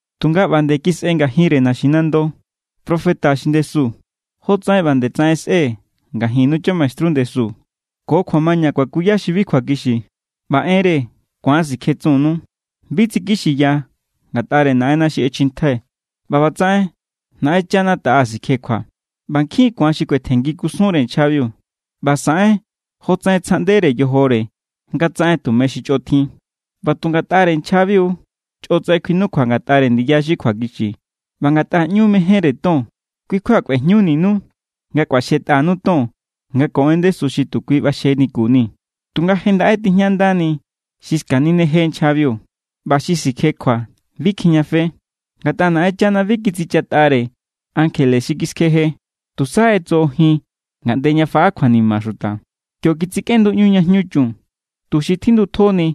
Tunga ꞌba nde kisꞌe ngajinre naxinando profeta xi ndesu, jotsaꞌen ꞌba nde tsaꞌen sꞌe̱ ngajinnu chamaestru ndesu. Ko kjuamaña kuakuya xi bi kjuakixi, ꞌba enre ku̱an sikjetsunnu. Bi tsikixiya ngatꞌare Naꞌenna xi ꞌechjintjai̱. ꞌBa ꞌbatsaꞌen Naꞌenchana taꞌa sikjekjua. ꞌBa nkjin= ku̱an xi kuetjenngi kusunre nchjabiu, ꞌba saꞌen jotsaꞌen tsjaꞌndere yojore nga tsaꞌen tume xi chꞌo tjin. ꞌBa tu ngatꞌare nchjabiu= chꞌotsaꞌen kjuinukjua ngatꞌare ndiya xi kjuakixi. ꞌBa ngatꞌa ꞌñu mejénre ton, kui kjua kꞌuejñuninu nga kꞌuaxjetꞌanu ton nga ko en ndesu xi tu kui ꞌbaxjenikunii̱. Tunga je ndaꞌe tijñandani xi skanineje nchjabiu. ꞌBa xi sikjekjua bi kjijñafe. Ngatꞌa Naꞌenchana bi kitsichatꞌare ankjele xi kiskjeje. Tusa ꞌetsojojin ngaꞌnde ña faꞌa kjuanima xuta. Kio kitsikꞌenduꞌñu ña jñu chun, tuxi tjindutjoni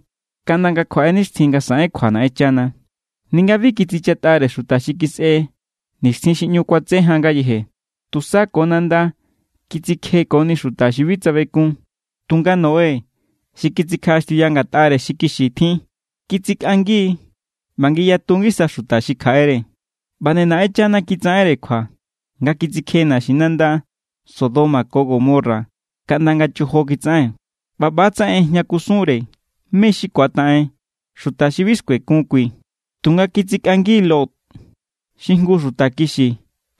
kaꞌnda nga kjuaꞌe nixtjin nga saꞌen kjua Naꞌenchana. Ninga bi kitsichatꞌare xuta xi kisꞌe nixtjin xi ꞌñu kuatse jan ngayeje. Tusa ko nanda kitsikjekoni xuta xi bi tsabekun. Tunga Noé xi kitsikjaꞌaxtiuya ngatꞌare xi kixi tjin, kitsikꞌangi= ꞌba ngiyatu ngisa xuta xi kjaꞌere. ꞌBa nde Naꞌenchana kitsaꞌenre kjua nga kitsikje naxinanda Sodoma ko Gomorra kaꞌnda nga chojo kitsaꞌen. ꞌBa ꞌba=tsaꞌen ꞌejña kusunre mé= xi ku̱ataꞌen xuta xi bi skuekun kui. Tunga kitsikꞌangi Lot, xi jngu xuta kixi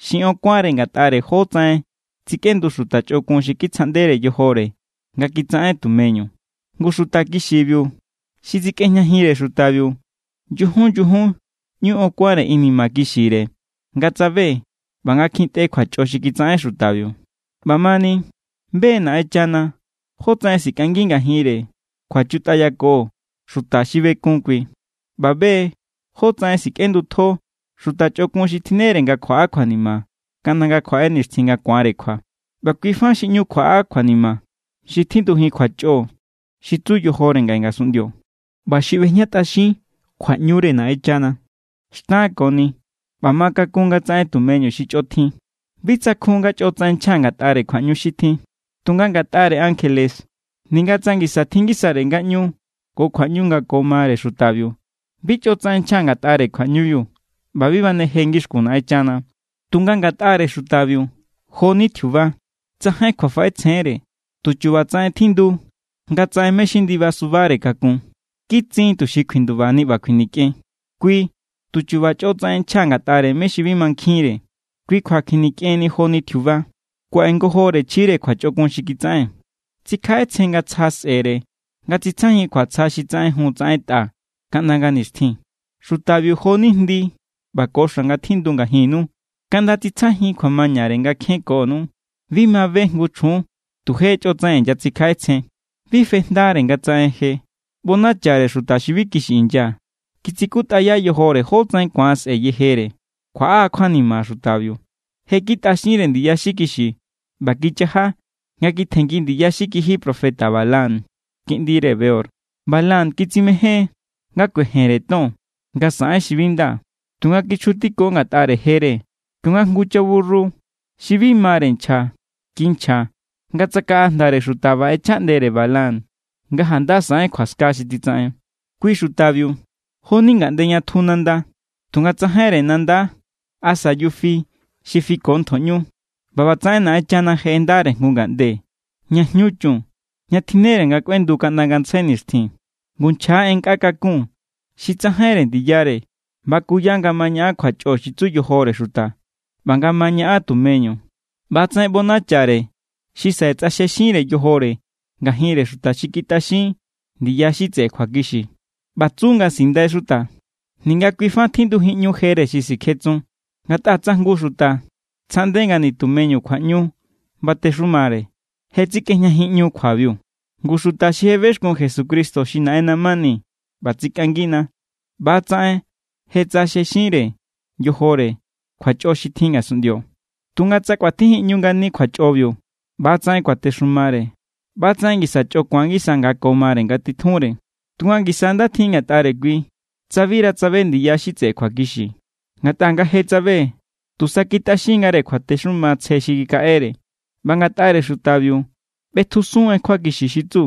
xi on kuánre ngatꞌare jótsaꞌen tsikꞌendu xuta chꞌokun xi kitsjaꞌndere yojore nga kitsaꞌen tumeñu. Ngu xuta kixibiu xi tsikꞌejñajinre xutabiu, nyujun nyujun ꞌñu on kuánre inima kixire nga tsabe ꞌba nga kjintꞌe kjuachꞌo xi kitsaꞌen xutabiu. ꞌBamani, be= Naꞌenchana jótsaꞌen sikꞌangi ngajinre kjuachutꞌayako xuta xi bekun kui. ꞌBa be= jótsaꞌen sikꞌendutjo xuta chꞌokun xi tjinnere nga kjuaꞌa kjuanima kaꞌnda nga kjuaꞌe nixtjin nga ku̱anre kjua. ꞌBa kui fa xi ꞌñu kjuaꞌa kjuanima xi tjindujin kjuachꞌo xi tsu yojore ngaꞌe ngasunꞌndio ꞌba xi ꞌbejñatꞌaxin kjuaꞌñure Naꞌenchana. Xtankoni ꞌba ma kakun nga tsaꞌen tumeñu xi chꞌo tjin. Bi tsakjun nga chꞌotsaꞌen nchja ngatꞌare kjuaꞌñu xi tjin. Tunga ngatꞌare ankjele, ninga tsa ngisa tjin ngisare ngaꞌñu ko kjuaꞌñu nga ko mare xutabiu, bi chꞌotsaꞌen nchja ngatꞌare kjuaꞌñubiu ꞌba bi baneje ngixkun Naꞌenchana. Tunga ngatꞌare xutabiu, jo=ni tjiuba. Tsajain kjuafaꞌetsjeénre. Tu chubatsaꞌen tjindu nga tsaꞌen mé= xi ndiba subare kakun. Kitsin tuxi kjuindubani ꞌba kjuinikꞌen. Kui tu chu̱ba̱ chꞌotsaꞌen nchja ngatꞌare mé= xi bi mankjinre. Kui kjua kjuinikjeni joni tjiuba. Kuaꞌe ngojore chjire kjuachꞌokun xi kitsaꞌen. Tsikjaꞌetsjen nga tsja sꞌe̱re nga tsitsjajin kjuatsja xi tsaꞌenjun tsaꞌentꞌa kaꞌnda nga nixtjin. Xutabiu jo=ni jndi ꞌba ko xa̱ nga tjindu ngajinnu. Kaꞌnda tsitsjajin kjuamañare nga kjenkonu. Bi ma be jngu chjun tu je chꞌotsaꞌen inyatsikjaꞌetsjen. Bi fejndare nga tsaꞌen je. ꞌBonachare xuta xi bi kixi inya. Kitsikutꞌaya yojore jótsaꞌen ku̱an sꞌe yejere. Kjuaꞌa= kjuanima xutabiu. Je kitꞌaxinre ndiya xi kixi ꞌba kichaja nga kitjenngi ndiya xi kijiya profeta Balaam kiꞌndire Beor. Balaam kitsimején= nga kuejenre ton nga saꞌen xi bi nda. Tunga kichjutiko ngatꞌare jere kionga jngu chaburru xi bi mare nchja kinchja nga tsakaꞌa jndare xuta ꞌba ꞌechjaꞌndere Balaam nga janda saꞌen kjuaska xi titsaꞌen. Kui xutabiu jo=ni ngaꞌnde ña tju nanda tunga tsajainre nanda asa yufi xi fiko ntjoꞌñu. ꞌBa ꞌbatsaꞌen Naꞌenchana je ꞌendare jngu ngaꞌnde ña ꞌñu jñu chun, ña tjinnere nga kꞌuendu kaꞌnda ngantsjai nixtjin. Ngu nchja= en nkꞌa kakun xi tsajainre ndiyare. Bakuya nga ma ñaꞌan kjuachꞌo xi tsu yojore xuta ꞌba nga ma ñaꞌan tumeñu. ꞌBa=tsaꞌen ꞌbonachare xi saꞌe tsꞌaxjexinre yojore ngajinre xuta xi kitꞌaxin ndiya xi tseꞌe kjuakixi. ꞌBa tsu nga sindai xuta, ninga kui fa tjindujinꞌñu jere xi sikjetsun. Ngatꞌa tsa jngu xuta tsjaꞌnde nga nitumeñu kjua batexumare, je tsikꞌejñajinꞌñu kjuabiu. Ngu xuta xi je bexkun Jesucristo xi Naꞌenna mani ꞌba tsikꞌangina, ꞌba=tsaꞌen je tsꞌaxjexinre yojore kjuachꞌo xi tjin ngasunꞌndio. Tunga tsa kꞌuatjijinꞌñu ngani kjuachꞌobiu ꞌba ꞌba=tsaꞌen kuatexumare, ꞌba=tsaꞌen ngisa chꞌo ku̱an ngisa nga ko mare nga titjunre. Tusa ngisa nda tjin ngatꞌare kui tsa bira tsabe ndiya xi tseꞌe kjuakixi, ngatꞌa nga je tsabe, tusa kitꞌaxin=ngare kjuatexuma tsje xi kikaꞌere. ꞌBa ngatꞌare xutabiu ꞌbetjusun en kjuakixi xi tsu: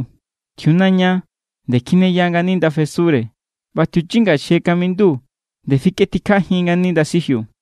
“Tjiunaña nde kjineya ngani ndafesure, ꞌba tjiuchinga xi je kamindu nde fikꞌetjikjajin ngani ndasijiu.”